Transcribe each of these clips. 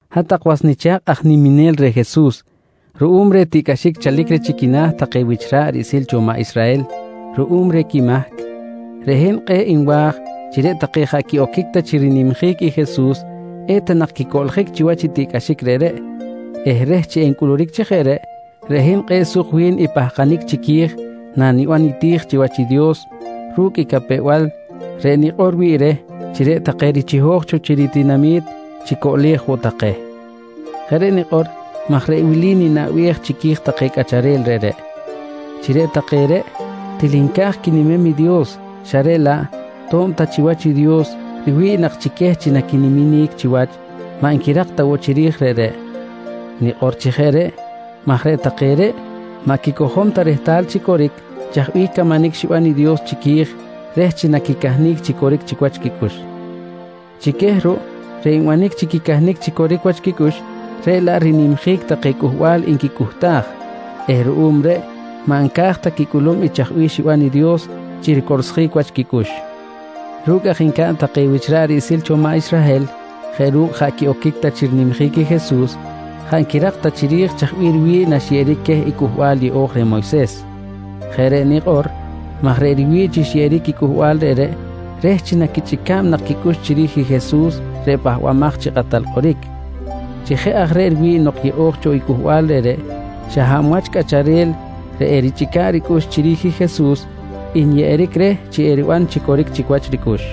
Hat-tak was nicha̱kꞌ aj niminel reh Jesus, ruꞌum reh tiꞌcꞌaxic chalic reh chi quina̱ take wich ra̱ꞌ riꞌsil cho maꞌ Israhel ruꞌum reh quimahc, reꞌ hin kꞌe̱ꞌ nwa̱j chi reꞌ take jaꞌ quiꞌoquic ta chi rinimjic i Jesus eta nak quicoꞌljic chiwach i tiꞌcꞌaxic reꞌreꞌ eh reh chi encꞌuluric chi jeꞌ reꞌ, reꞌ hin kꞌe̱ꞌ suk wi̱n i pahkanic chiqui̱j naniban niti̱j chiwach i Dios ru̱cꞌ i capew-bal reꞌ nikꞌor wi̱ꞌ reh chi reꞌ take richiho̱j cho chi ritinami̱t chicoꞌlej woꞌ take. Jeꞌ reꞌ nikꞌor maj reꞌ wili ninaꞌbej chiqui̱j take cꞌacharel reꞌreꞌ: Chi reꞌ take reꞌ til nca̱j quinimem i Dios xa reꞌ laꞌ to̱b ta chiwach i Dios riwi̱ꞌ nak chi queh chi naquiniminic chiwach, maꞌ nquirak ta woꞌ chiri̱j reꞌreꞌ. Nikꞌor chi jeꞌ reꞌ maj reꞌ take reꞌ maꞌ quicojom ta rehtal chi coric chaj bih camanic xiban i Dios chiqui̱j reh chi naquicahnic chi coric chic wach quicꞌux. Chi queh ruꞌ reꞌ nbanic chi quicahnic chi coric wach quicꞌux reꞌ laꞌ rinimjic take cꞌuhbal nquicꞌuhtaj eh ruꞌum reꞌ maꞌ nca̱j ta quicꞌulum i chaj bih xiban i Dios chi ricorsjic wach quicꞌux. Ru̱cꞌ aj ncaꞌn take wich ra̱ꞌ riꞌsil cho maꞌ Israhel jeꞌ ru̱cꞌ jaꞌ quiꞌoquic ta chi rinimjic i Jesus, jaꞌ nquirak ta chiri̱j chaj bih riwi̱ꞌ naxyeꞌeric queh i Cꞌuhbal Yeꞌo̱j reh Moyses. Jeꞌ reꞌ nikꞌor maj reꞌ riwi̱ꞌ chi xyeꞌeric i cꞌuhbal reꞌreꞌ reh chi naquichꞌica̱b nak quicꞌux chiri̱j i Jesus reꞌ Pahbamaj chi Kꞌatal Kꞌoric. Chi jeꞌ aj reꞌ riwi̱ꞌ nok yeꞌo̱j cho i cꞌuhbal reꞌreꞌ, xa hab wach cꞌacharel reꞌ erichꞌica̱ꞌ ricꞌux chiri̱j i Jesus nyeꞌeric reh chi eriban chi coric chic wach ricꞌux.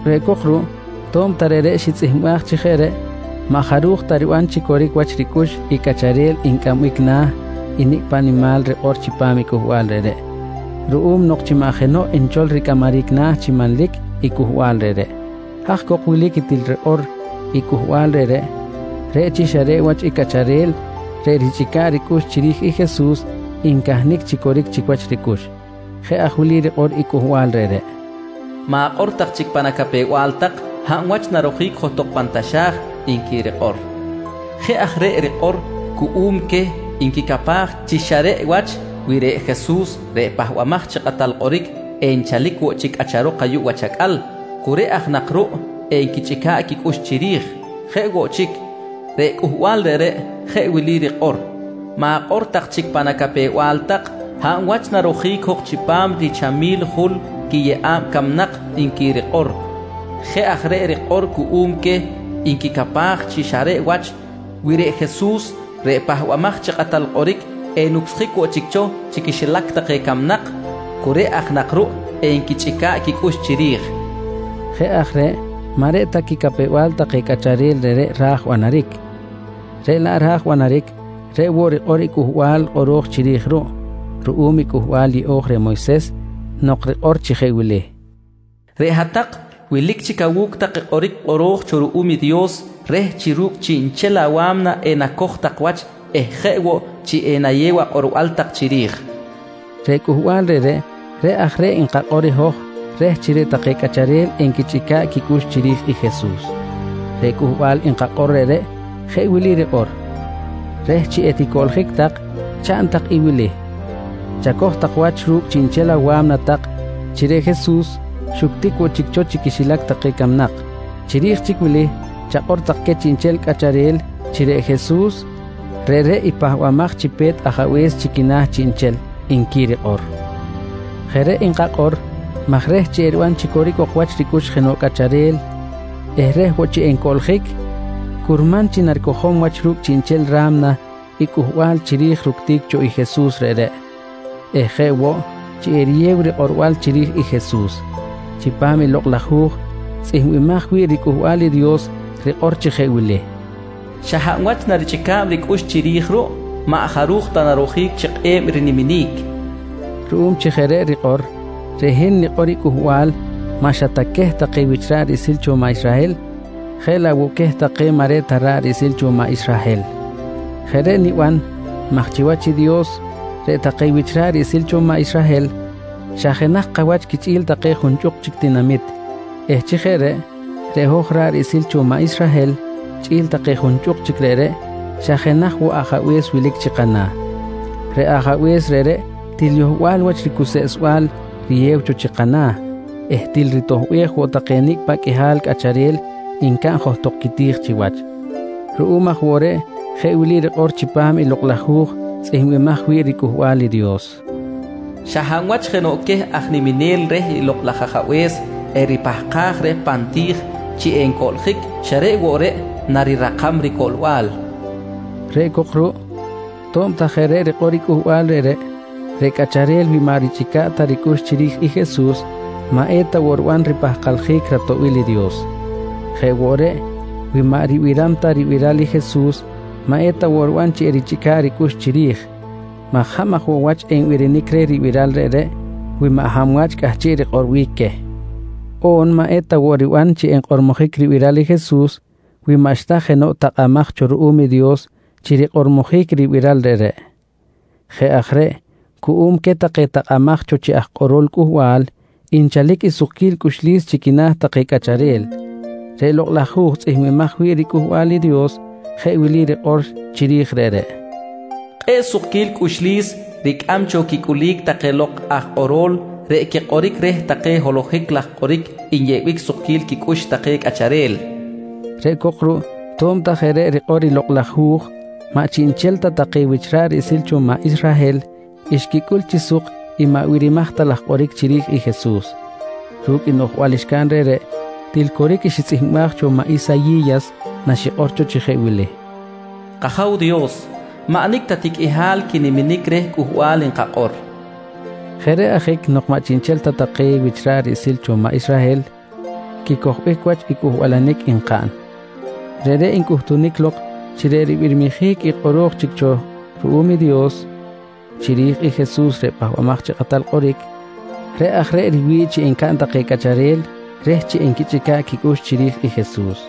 Reꞌ cok ruꞌ to̱b ta reꞌreꞌ xitzꞌihmbaj chi jeꞌ reꞌ, maꞌ jaruj ta riban chi coric chic wach ricꞌux i cꞌacharel ncꞌambic na̱ nicꞌ paꞌ nimal rikꞌor chipam i cꞌuhbal reꞌreꞌ ruꞌum nok chi maꞌ jenoꞌ nchol ricꞌamaric na̱ chi manlic i cꞌuhbal reꞌreꞌ. Haj cok wilic i til rikꞌor i cꞌuhbal reꞌreꞌ, reꞌ chi xa reꞌ wach i cꞌacharel reꞌ richꞌica̱ꞌ ricꞌux chiri̱j i Jesus ncahnic chi coric chic wach ricꞌux. Jeꞌ aj wili rikꞌor i cꞌuhbal reꞌreꞌ: “Ma̱kꞌor tak chic pan acapew-bal tak, hab wach narojic johtok pan taxa̱j, nqui rikꞌor. Jeꞌ aj reꞌ rikꞌor cuꞌum queh nquicapaj chi xa reꞌ wach wi reꞌ Jesus reꞌ Pahbamaj chi Kꞌatal Kꞌoric enchalic woꞌ chic cꞌacharok ayuꞌ wach acꞌal, cu reꞌ aj nak ruꞌ enquichꞌica̱ꞌ quicꞌux chiri̱j. Jeꞌ woꞌ chic, reꞌ cꞌuhbal reꞌreꞌ jeꞌ wili rikꞌor: “Ma̱kꞌor tak chic pan acapew-bal tak, hab wach narojic jok chipam richamil jul quiyeꞌa̱b camnak, nqui rikꞌor. Jeꞌ aj reꞌ rikꞌor cuꞌum queh nquicapaj chi xa reꞌ wach wi reꞌ Jesus reꞌ Pahbamaj chi Kꞌatal Kꞌoric enucsjic woꞌ chic cho chi quixilac take camnak, cu reꞌ aj nak ruꞌ enquichꞌica̱ꞌ quicꞌux chiri̱j. Jeꞌ aj reꞌ maꞌ reꞌ ta quicapew-bal take cꞌacharel reꞌreꞌ ra̱j banaric, reꞌ laꞌ ra̱j banaric reꞌ woꞌ rikꞌor i cꞌuhbal kꞌoro̱j chiri̱j ruꞌ ruꞌum i Cꞌuhbal Yeꞌo̱j reh Moyses nok rikꞌor chi jeꞌ wili: “Reꞌ hat-tak wilic chic awu̱cꞌ tak i kꞌoric kꞌoro̱j cho ruꞌum i Dios reh chi ru̱cꞌ chiꞌnchel awa̱mna enacoj tak wach eh jeꞌ woꞌ chi enayew akꞌorbal tak chiri̱j, nqui rikꞌor. Reꞌ cꞌuhbal reꞌreꞌ, reꞌ aj reꞌ nkakꞌor i hoj reh chi reꞌ take cꞌacharel enquichꞌica̱ꞌ quicꞌux chiri̱j i Jesus. Reꞌ cꞌuhbal nkakꞌor reꞌreꞌ jeꞌ wili rikꞌor: “Reh chi eticoꞌljic tak, chaꞌn tak i wili: Chacoj tak wach ru̱cꞌ chiꞌnchel awa̱mna tak chi reꞌ Jesus xuctic woꞌ chic cho chi quixilac take camnak. Chiri̱j chic wili chakꞌor tak queh chiꞌnchel cꞌacharel chi reꞌ Jesus reꞌreꞌ i pahbamaj chi pe̱t Ajabe̱s chi quina̱ chiꞌnchel, nqui rikꞌor. Jeꞌ reꞌ nkakꞌor maj reh chi eriban chi coric ok chic wach ricꞌux jenoꞌ cꞌacharel eh reh chi ewoꞌ ncoꞌljic, curman chi naricojom wach ru̱cꞌ chiꞌnchel ra̱mna i cꞌuhbal chiri̱j i ructic cho i Jesus reꞌreꞌ eh jeꞌ woꞌ chi eriyew rikꞌorbal chiri̱j i Jesus. Chipam i Lokꞌ laj Hu̱j tzꞌihmbimaj wi̱ꞌ riCꞌuhbal i Dios rikꞌor chi jeꞌ wili: “Xa hab wach narichꞌica̱b ricꞌux chiri̱j ruꞌ maꞌ jaruj ta narojic chi kꞌe̱b i riniminic, nqui rikꞌor. Ruꞌum chi jeꞌ reꞌ rikꞌor, reꞌ hin nikꞌor i cꞌuhbal maꞌ xa ta queh take wich ra̱ꞌ riꞌsil cho maꞌ Israhel jeꞌ laꞌ woꞌ queh take maꞌ reꞌ ta ra̱ꞌ riꞌsil cho maꞌ Israhel. Jeꞌ reꞌ niban maj chiwach i Dios reꞌ take wich ra̱ꞌ riꞌsil cho maꞌ Israhel xa jenaj kawach quichꞌi̱l take junchꞌuk chic tinamit eh chi jeꞌ reꞌ, reꞌ hoj ra̱ꞌ riꞌsil cho maꞌ Israhel chꞌi̱l take junchꞌuk chic reꞌreꞌ xa jenaj woꞌ Ajabe̱s wilic chi kana̱. Reꞌ Ajabe̱s reꞌreꞌ til yohbal wach ricuseꞌsbal riyew cho chi kana̱ eh til ritoꞌbej woꞌ take nicꞌ paꞌ qꞌuihal cꞌacharel ncaꞌn johtok quiti̱j chiwach. Ruꞌum aj woꞌ reꞌ jeꞌ wili rikꞌor chipam i Lokꞌ laj Hu̱j tzꞌihmbimaj wi̱ꞌ riCꞌuhbal i Dios: “Xa hab wach jenoꞌ queh aj niminel reh i Lokꞌ laj Ajabe̱s eripahkaj reh pan ti̱j chi encoꞌljic, xa reꞌ woꞌ reꞌ narirakam ricoꞌlbal, nqui rikꞌor. Reꞌ cok ruꞌ to̱b ta jeꞌ reꞌ rikꞌor i Cꞌuhbal reꞌreꞌ, reꞌ cꞌacharel wi maꞌ richꞌica̱ꞌ ta ricꞌux chiri̱j i Jesus maꞌ eta woꞌ riban ripahkaljic ratoꞌbil i Dios. Jeꞌ woꞌ reꞌ, wi maꞌ ribiram ta ribiral i Jesus maꞌ eta woꞌ riban chi erichꞌica̱ꞌ ricꞌux chiri̱j, maj hab aj woꞌ wach enbirinic reh ribiral reꞌreꞌ wi maꞌ hab wach cꞌahchiꞌ rikꞌorbic queh? On maꞌ eta woꞌ riban chi enkꞌormojic ribiral i Jesus wi maꞌxta jenoꞌ takꞌamaj cho ruꞌum i Dios chi rikꞌormojic i ribiral reꞌreꞌ. Jeꞌ aj reꞌ cuꞌum queh take takꞌamaj take cho chi aj kꞌoro̱l cꞌuhbal nchalic i sukquil cꞌuxlis chi quina̱ take cꞌacharel. Reꞌ Lokꞌ laj Hu̱j tzꞌihmbimaj wi̱ꞌ riCꞌuhbal i Dios jeꞌ wili rikꞌor chiri̱j reꞌreꞌ: “Kꞌe̱ꞌ sukquil cꞌuxlis ricꞌam cho quicꞌulic take lok aj kꞌoro̱l reꞌ quikꞌoric reh take holohic laj kꞌoric nyeꞌbic sukquil quicꞌux take cꞌacharel, nqui rikꞌor. Reꞌ cok ruꞌ to̱b ta jeꞌ reꞌ rikꞌor i Lokꞌ laj Hu̱j, maꞌ chiꞌnchel ta take wich ra̱ꞌ riꞌsil cho maꞌ Israhel xquicꞌul chi suk i maꞌ birimaj ta laj kꞌoric chiri̱j i Jesus. Ru̱cꞌ i noꞌjbal xcaꞌn reꞌreꞌ, til coric i xitzꞌihmbaj cho maꞌ Isayi̱yas naxikꞌor cho chi jeꞌ wili: “K-Aja̱w Dios, maꞌ nicꞌ ta ti qꞌuihal quiniminic reh cꞌuhbal nkakꞌor, nqui xikꞌor. Jeꞌ reꞌ ajic nok maꞌ chiꞌnchel ta take wich ra̱ꞌ riꞌsil cho maꞌ Israhel quicojbic wach i cꞌuhbalanic nkaꞌn, reꞌreꞌ ncꞌuhtunic lok chi reꞌ ribirmijic i kꞌoro̱j chic cho ruꞌum i Dios chiri̱j i Jesus reꞌ Pahbamaj chi Kꞌatal Kꞌoric, reꞌ aj reꞌ riwi̱ꞌ chi encaꞌn take cꞌacharel reh chi enquichꞌica̱ꞌ quicꞌux chiri̱j i Jesus.